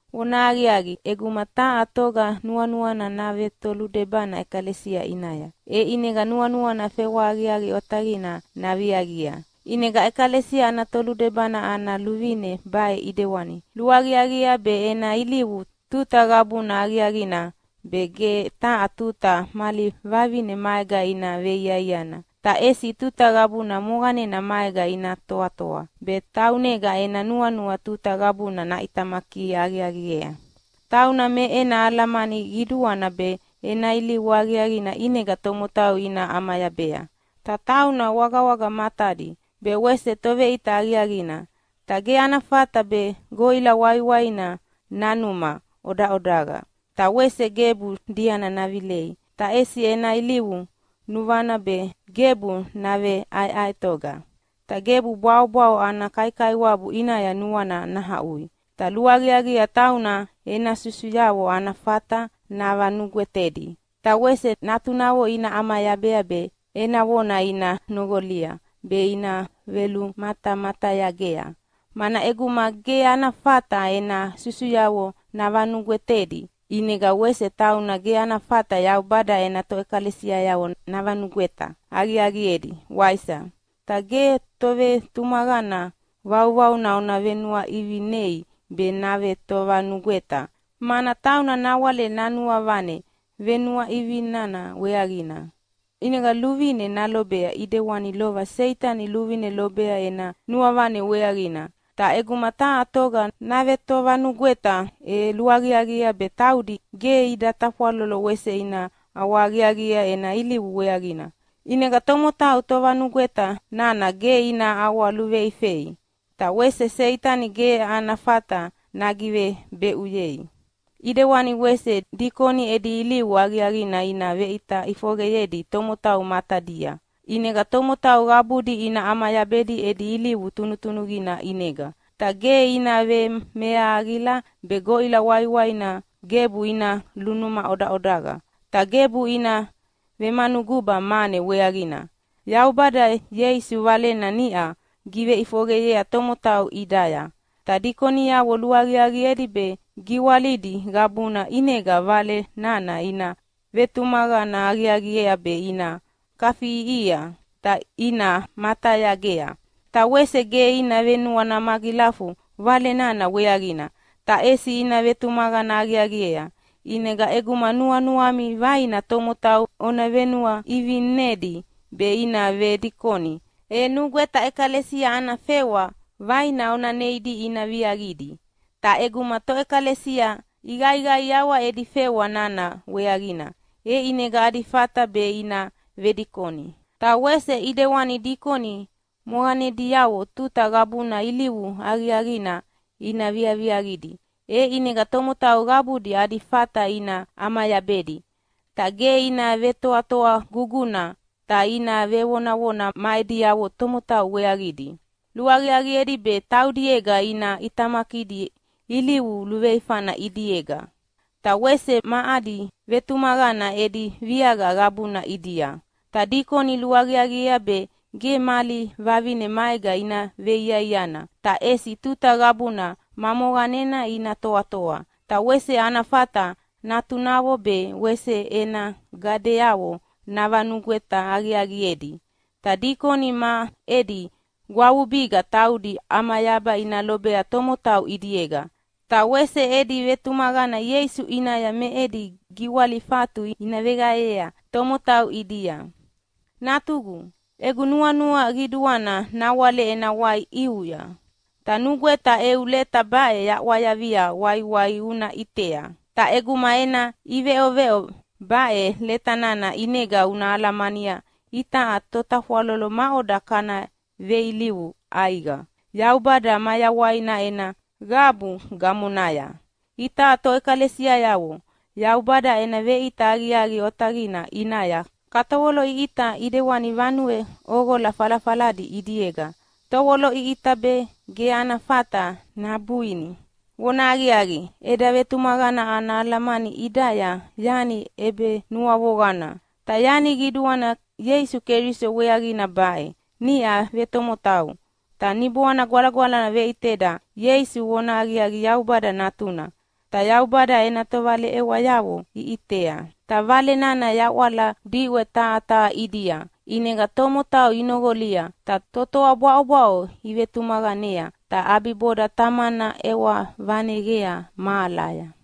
Vonahaqiaqi, ʼeguma taha toga nuanuana navetoludebana ʼekalesia ʼinaya, e ʼinega nuanuana fewa aqiaqi otaqina naviaqia. ʼInega ʼekalesia ana toludebana ana luvine baʼe ʼidewana: Luaqiaqiea be ena ilivu tuta qabuna aqiaqina be, ge taha tuta mali vavine maega ina veiaiana, ta ʼesi tuta qabuna moqanena maega ina toatoa be, taunega ena nuanua tuta qabuna naʼitamaki aqiaqiea. Tauna me ena alamani qiduana be, ena ilivu aqiaqina ʼinega tomotau ina ʼamayabea. Ta tauna wagawaga matadi, be wese toveʼita aqiaqina. Ta ge ana fata be goʼila waiwaina nanuma ʼodaʼodaqa, ta wese gebu diana navilei, ta ʼesi ena ilivu nuvana be gebu naveʼaeʼaetoga. Ta gebu bwaʼobwaʼo ana kaikaiwabu ʼinaya nuana nahaʼui. Ta luaqiaqiea tauna ena susuyavo ana fata navanugwetedi. Ta wese natunavo ina ʼamayabea be ena vona ina noqolia be ina velumatamatayagea. Mana ʼeguma ge ana fata ena susuyavo navanugwetedi, ʼinega wese tauna ge ana fata Yaubada ena toʼekalesiayavo navanugweta aqiaqiedi, waisa? Ta ge tovetumaqana vauvauna ona venuaʼivinei be navetovanugweta, mana tauna nawale nanuavane venuaʼivinana weaqina ʼinega luvine nalobea ʼidewani lova Seitani luvine lobea ena nuavane weaqina. Ta ʼeguma taha toga navetovanugweta e luaqiaqiea be taudi ge ida tafwalolo wese ina ʼawahaqiaqiea ena ilivu weaqina. ʼInega tomotau tovanugweta nana ge ina ʼawaluveifei, ta wese Seitani ge ana fata nagivebeʼuyei. ʼIdewani wese dikoni edi ilivu aqiaqina ina veʼita ʼifoqeyedi tomotau matadia, ʼinega tomotau qabudi ina ʼamayabedi edi ilivu tunutunuqina ʼinega. Ta ge ina vemeahaqila be goʼila waiwaina gebu ina lunuma ʼodaʼodaqa. Ta gebu ina vemanuguba mane weaqina. Yaubada Ieisu Valena niʼa giveʼifoqeyea tomotau ʼidaya. Ta dikoniavo luaqiaqiedi be giwalidi qabuna ʼinega Vale nana ina vetumaqana aqiaqiea be ina kafiʼiʼihia, ta ina matayagea. Ta wese ge ina venuana magilafu Vale nana weaqina, ta ʼesi ina vetumaqana aqiaqiea. ʼInega ʼeguma nuanuami vaina tomotau ona venuaʼivinedi be ina vedikoni, e nugweta ʼekalesia ana fewa vaina ona neidi ina viaqidi. Ta ʼeguma toʼekalesia iqaiqaiawa edi fewa nana weaqina, e ʼinega adi fata be ina vedikoni. Ta wese ʼidewani dikoni moqanediavo tuta qabuna ilivu aqiaqina ina viaviaqidi, e ʼinega tomotau qabudi adi fata ina ʼamayabedi. Ta ge ina vetoatoa guguna ta ina vevonavona ma ediavo tomotau weaqidi. Luaqiaqiedi be taudiega ina ʼitamakidi ilivu luveifana ʼidiega. Ta wese ma adi vetumaqana edi viaqa qabuna ʼidia. Ta dikoni luaqiaqiea be ge mali vavine maega ina veiaiana, ta ʼesi tuta qabuna ma moqanena ina toatoa, ta wese ana fata natunavo be wese ena gadeavo navanugweta aqiaqiedi. Ta dikoni ma edi gwavubiga taudi ʼamayaba ina lobea tomotau ʼidiega, ta wese edi vetumaqana Ieisu ʼinaya me edi giwalifatu ina veqaeyea tomotau ʼidia. Natugu, egu nuanua qiduana nawale ena wai ʼiuya, ta nugweta eu leta baʼe yaʼwayavia waiwai una ʼitea. Ta ʼeguma ena ʼiveʼoveʼo baʼe leta nana ʼinega una alamania itaʼa totafwalolo maʼoda kana veilivu ʼaiqa Yaubada mayawaina ena qabu gamonaya. Itaʼa toʼekalesiayavo Yaubada ena veʼita aqiaqi otaqina ʼinaya katovoloʼiʼita ʼidewani vanue ʼoqola falafaladi ʼidiega tovoloʼiʼita be ge ana fata nabuini. Vonahaqiaqi, eda vetumaqana ana alamani ʼidaya yani ʼebenuavoqana. Ta yani qiduana Ieisu Keliso weaqina baʼe: Niʼa vetomotau, ta Niboana Gwalagwalana veʼiteda Ieisu vonahaqiaqi Yaubada Natuna, ta Yaubada ena tovaleʼewayavo iʼitea, ta Vale nana yawala diʼwe taha taha ʼidia ʼinega tomotau inoqolia, ta totoa bwaʼobwaʼo ivetumaqanea. Ta ʼabiboda Tamana ʼewa vaneqea mahalaya.